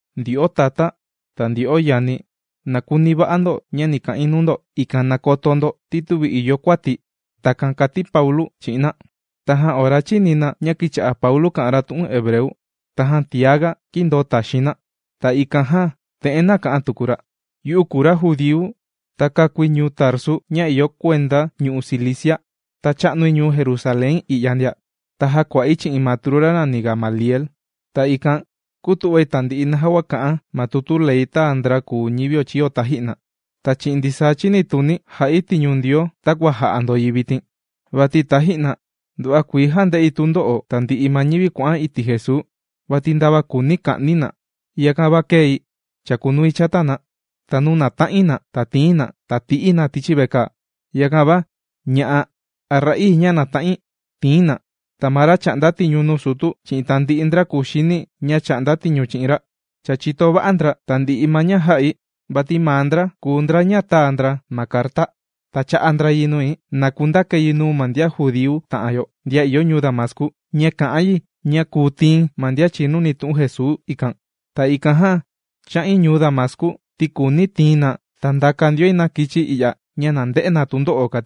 ―Ndyo'o tatá ta ndyo'o yani, na kuni va'a ndo ña ni ka'in nuu ndo, ikan na koto ndo ti tüvi ìyo kuati̱. ―Takan kàti Paulu chi'in na. Tajan ora chīni na ña kīcha'a Paulu kà'an ra tu'un hebreu, tajan tiaga kīndoo taxiin na. Ta ikan jan te'en nāka'an tuku ra: ―Yu'u kùu ma ra judíu, ta kākui ñuu Tarsu ña ìyo kuenda ñu'u' Cilicia. Ta chā'nui ñuu Jerusalén i'ya ndia. Ta jākua'i chi'in matru ra nàni Gamaliel. Ta ikan kūtu'vai tandi'i naja kua kà'an ma tutu Ley tāa ndra kùu ñivio chīyo taji'na. Ta chi'in ndisaa chinituni̱, jà'i tiñu Ndioo takua jà'a ndo yi vitin. Vati taji'na, nduva'a kuii jānde'i tundo'o tandi'i ma ñivi kuà'an iti' Jesuu vati ndava kùuni ka'ni̱ na. Yakan va kēi chākunui chata na. Ta nuu nàta'in na ta tìi̱n na, ta tì'i̱ na tichi vekaa. Yakan va, ña'a a ra'ii ña nàta'in, tīi̱n na. Ta ma ra chà'nda tiñu nuu sutu, chi'in tandi'i ndra kuxini ña chà'nda tiñu chi'in ra, cha chìto va'a ndra tandi'i ma ña jā'i. Vati maa ndra kùu ndra ña tāa ndra ma carta, ta chā'a ndra yi nui na kundakai yi nuu ma ndian judíu ta'an yo ndian ìyo ñuu Damascu ña kà'an yi ña kùu tii̱n ma ndian chìnuni tu'un Jesuu ikan. Ta ikan jan chā'in ñuu Damascu ti kùuni̱ tii̱n na ta ndaka ndioi na kichai i'ya ña na nde'e na tundo'o.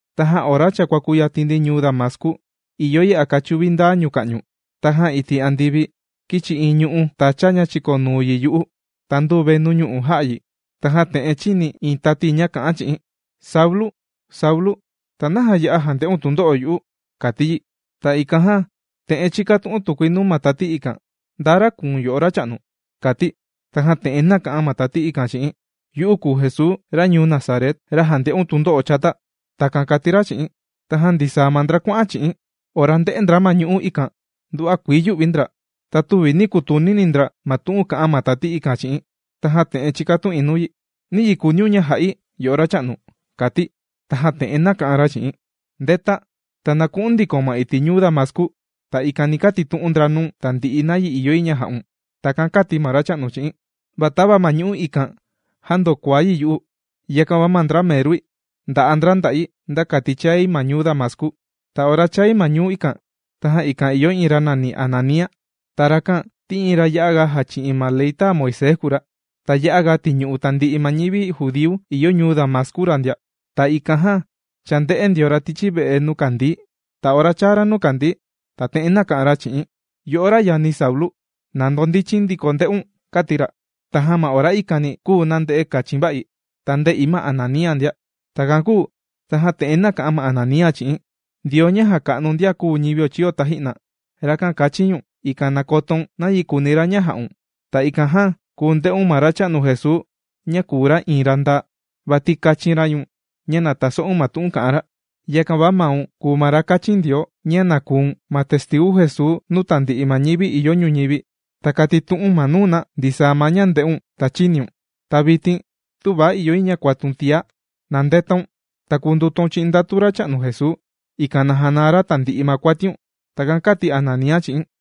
’Tajan ora cha kuàkuyatin ndi ñuu Damascu, ìyo yi a kachuvi ndaa ñuka'ñu, tajan iti' andivi kīchi iin ñu'ú tacha ña chìkonuu yi yu'u. Ta ndūvai nuu ñu'u' jā'a yi. Tajan te'en chīni̱ iin tati ña kà'an chi'i̱n: “Saulu, Saulu, ta, ¿naja ya'a jànde'un tundo'o yu'u?” kàti yi. Ta ikan jan, te'en chīkatu'un tukui nuu ma tati ikan: “¿Nda ra kùu̱n yo'o Racha'nu?”, kati̱. Tajan te'en nāka'an ma tati ikan chi'i̱n: “Yu'u kùu Jesuu ra ñuu Nazaret, ra jànde'un tundo'o chata.” Takan kàti ra chi'i̱n. Tajan ndisaa ma ndra kuà'an chi'i̱n, ora ndē'e ndra ma ñu'ú ikan, nduva'a kuii yū'vi ndra. Ta tüvi nī kutunini ndra ma tu'un kā'an ma tati ikan chi'i̱n. Tajan te'en chīkatu'in nuu yi: “¿Nayi kùuniun ña ja'i, yo'o Racha'nu?”, kāti̱. Tajan te'en nāka'an ra chi'i̱n: “¡Ndeta, ta na ku'u̱n ndikoun ma iti' ñuu Damascu! Ta ikan ni katitu'un ndra nuu̱n tandi'i ma nayi ìyo yi ña ja'un.” Takan kāti ma Racha'nu chi'i̱n. Va tava ma ñu'ú ikan, jāndokuaa yi yu'u, yakan va ma ndra merui ndà'a ndra nda'i nda kati chāi ma ñuu Damascu. ’Ta ora chāi ma ñuu ikan, tajan ikan ìyo iin ra nàni Ananía. Ta rakan ti iin ra ya'a jàchi'in ma ley tāa Moisés kùu ra, ta ya'aga tìñu'u tandi'i ma ñivi judíu ìyo ñuu Damascu ra ndia. Ta ikan jan chānde'e ndio ra tichi ve'e nuu kàndii̱. Ta ora chāa ra nuu kàndii̱, ta te'en nāka'an ra chi'i̱n: “Yo'o ra yani Saulu. ¡Na ndondichin ndiko nde'un!”, kāti ra. Tajan ma ora ikani, kūu nande'e kachin va'i, ta ndē'i ma Ananía ndia. Takan kūu tajan te'en nāka'an ma Ananía chi'i̱n: “Ndioo ña jàka'nu ndian kūu ñivio taji'na, rakan kāchin ñu̱n, ikan na kotoun nayi kùuni ra ña ja'un. Ta ikan jan kùu nde'un ma Racha'nu Jesuu ña kùu ra iin ra ndaa, vati kāchin ra ñu̱n ña na taso'un ma tu'un kà'an ra. Yakan va maun kùu ma ra kāchin Ndioo ña na kùu̱n ma testigu Jesuu nuu tandi'i ma ñivi ìyo ñuñivi, ta katitu'u̱n ma nuu na ndisaa ma ña ndē'un ta chīniun. Ta vitin tüva ìyo yi ña kuatun tiá. ¡Na ndetaun, ta kundutaun chi'in ndatu Racha'nu Jesuu, ikan na janaa ra tandi'i ma kuatiun!” Takan kāti Ananía chi'i̱n.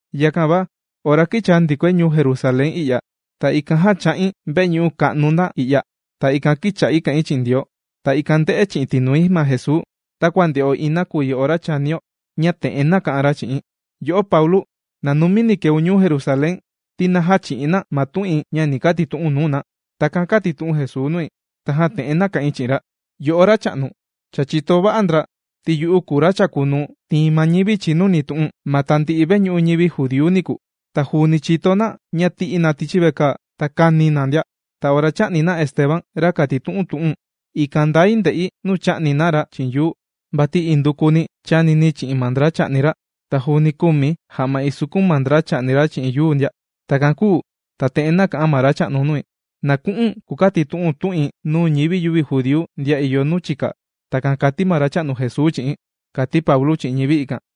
’Yakan va ora kīchaa ndikoi ñuu Jerusalén i'ya, ta ikan jan chā'in veñu'u ka'nu nda i'ya. Ta ikan kīcha'i kà'in chi'in Ndioo, ta ikan ndē'e chi'in tinui ma Jesuu, takua ndè'o iin nakuyi ora chànio, ña te'en nāka'an ra chi'i̱n: “Yo'o Paulu, ¡na numini keun ñuu Jerusalén, ti na jächi'in na ma tu'in ña ni katitu'u̱n nuu na!” Takan kātitu'un Jesuu nui. Tajan te'en nāka'in chi'in ra: “Yo'o Racha'nu, cha chìto va'a ndra ti yu'u kùu ma ra chàkunuu tìin ma ñivi chìnuni tu'u̱n ma tandi'i veñu'u ñivi judíu niku. Ta juuni chìto na ña tī'i̱ na tichi vekaa, ta kāni̱ na ndia. Ta ora chā'ni na Esteban, ra kàtitu'un tu'u̱n, ikan ndai ndè'i nuu chà'ni na ra chi'in yuu, vati induku chānini̱ chi'in ma ndra chà'ni ra. Ta juuni kūmi̱ ja'ma isukun ma ndra chà'ni ra chi'in yuu ndia.” Takan kūu ta te'en nāka'an ma Racha'nu nui: “Na ku'u̱n kukatitu'u̱n tu'in nuu ñivi yüvi judíu ndian ìyo nuu chika.” Takan kàti ma Racha'nu Jesuu chi'i̱n ―kàti Paulu chi'in ñivi ikan.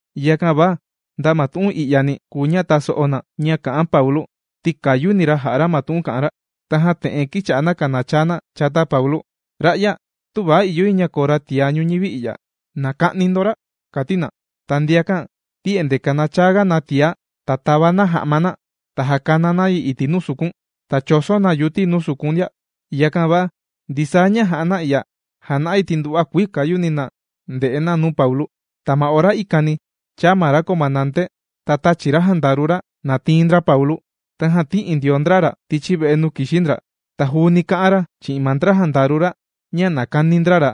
Yakan va nda ma tu'un i'yani, kùu ña taso'o na ña kà'an Paulu ti kàyuni na jà'a ma tu'un kà'an ra. Tajan te'en kīcha'a na kànachaa na chata Paulu: ―Ra'ya, tüva ìyo yi ña koo ra tiá ñuñivi i'ya. ¡Na ka'ni ndo ra! ―kàti na. Ta ndiakan ti endee kanachaaga na tiá, ta tàva na ja'ma na, ta jàkana na yi nuu sukun. Ta chòso na yuti nuu sukun ndia. Yakan va ndisaa ña jā'a na i'ya jàna'a yi ti nduva'a kuii kàyuni na ndè'e na nuu Paulu. Ta ma ora ikani, chāa ma ra comandante, ta tāchi ra jandaru ra na tiin ndra Paulu. Tajan tī'i ndio ndra ra tichi ve'e nuu kìxi ndra. Ta juuni kā'an ra chi'in ma ndra jandaru ra ña na kani ndra ra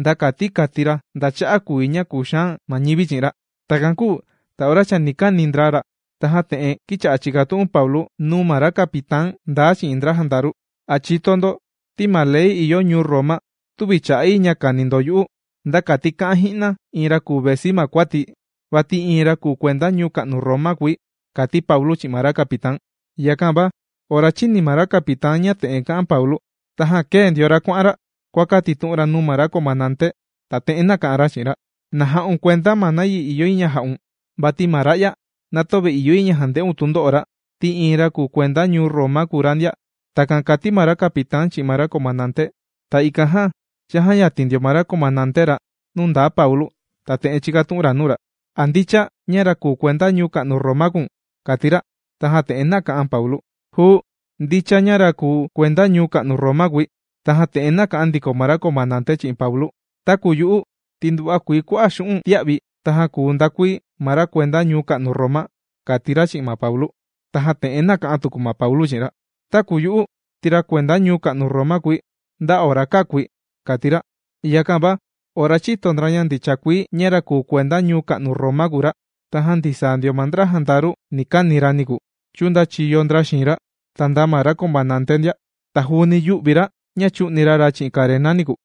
nda kati kati ra nda cha'a' kùu yi ña kùxaan ma ñivi chi'in ra. Takan kūu ta ora chani kani ndra ra, tajan te'en kīcha'a chìkatu'un Paulu nuu ma ra capitán ndaa chi'in ma ndra jandaru: ―¿A chìto ndo ti ma ley ìyo ñuu Roma tüvi chà'a yi ña kàni ndo yu'u nda kati ka'an ji'na iin ra kùu vesi ma kuati̱, vati iin ra kùu kuenda ñuu ka'nu Roma kùi? ―kàti Paulu chi'in ma ra capitán. Yakan va ora chīni ma ra capitán ña te'en kā'an Paulu, tajan kēe ndio ra kuà'an ra kuàkatitu'un ra nuu ma ra comandante. Ta te'en nāka'an ra chi'in ra: ―¡Na ja'un kuenda ma niyi ìyo yi ña ja'un, vati ma ra'ya na töve ìyo yi ña jande'un tundo'o ra ti iin ra kùu kuenda ñuu ka'nu Roma kùu ra ndia! ―Takan kàti ma ra capitán chi'in ma ra comandante. Ta ikan jan chājayatin ndio ma ra comandante ra nuu ndaa Paulu, ta te'en chīkatu'un ra nuu ra: ―¿A ndicha ña ra kùu kuenda ñuu ka'nu Roma kùu̱n? ―kàti ra. Tajan te'en nāka'an Paulu: ―Juu, ndicha ña ra kùu kuenda ñuu ka'nu Roma kùi. Tajan te'en nāka'an ndiko ma ra comandante chi'in Paulu: ―Taku yu'u ti nduva'a kuii kua'a' xu'un' tīa'vi̱, tajan kūu ndakui ma ra kuenda ñuu ka'nu Roma ―kàti ra chi'in ma Paulu. Tajan te'en nāka'an tuku ma Paulu chi'in ra: ―Taku yu'u ti ra kuenda ñuu ka'nu Roma kùi nda ora kākui ―kàti ra. Yakan va ora chīto ndra ña ndicha kùi ña ra kùu kuenda ñuu ka'nu Roma kùu ra, tajan ndisaa ndio ma ndra jandaru ni kani ra niku, chūndachiyo ndra xiin ra, ta nda ma ra comandante ndia. Ta juuni yū'vi ra ña chū'ni ra ra chi'in karena niku.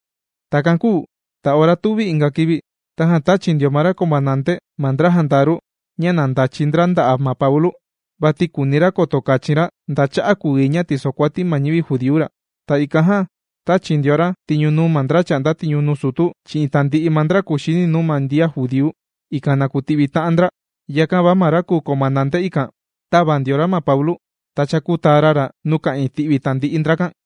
Takan kūu ta ora tuvi inga kivi, tajan tāchi ndio ma ra comandante ma ndra jandaru ña na ndachi ndra nda'a' ma Paulu. Vati kùuni ra koto kachin ra nda cha'a' kùu yi ña tìsokuati ma ñivi judíu ra. Ta ikan jan tāchi ndio ra tiñu nuu ma ndra chà'nda tiñu nuu sutu, chi'in tandi'i ma ndra kuxini nuu ma ndian judíu, ikan na kuti'vi ta'an ndra. Yakan va ma ra kùu comandante ikan tāva ndio ra ma Paulu, ta chākutaa ra ra nuu ka'ìin ti'vi tandi'i ndrakan.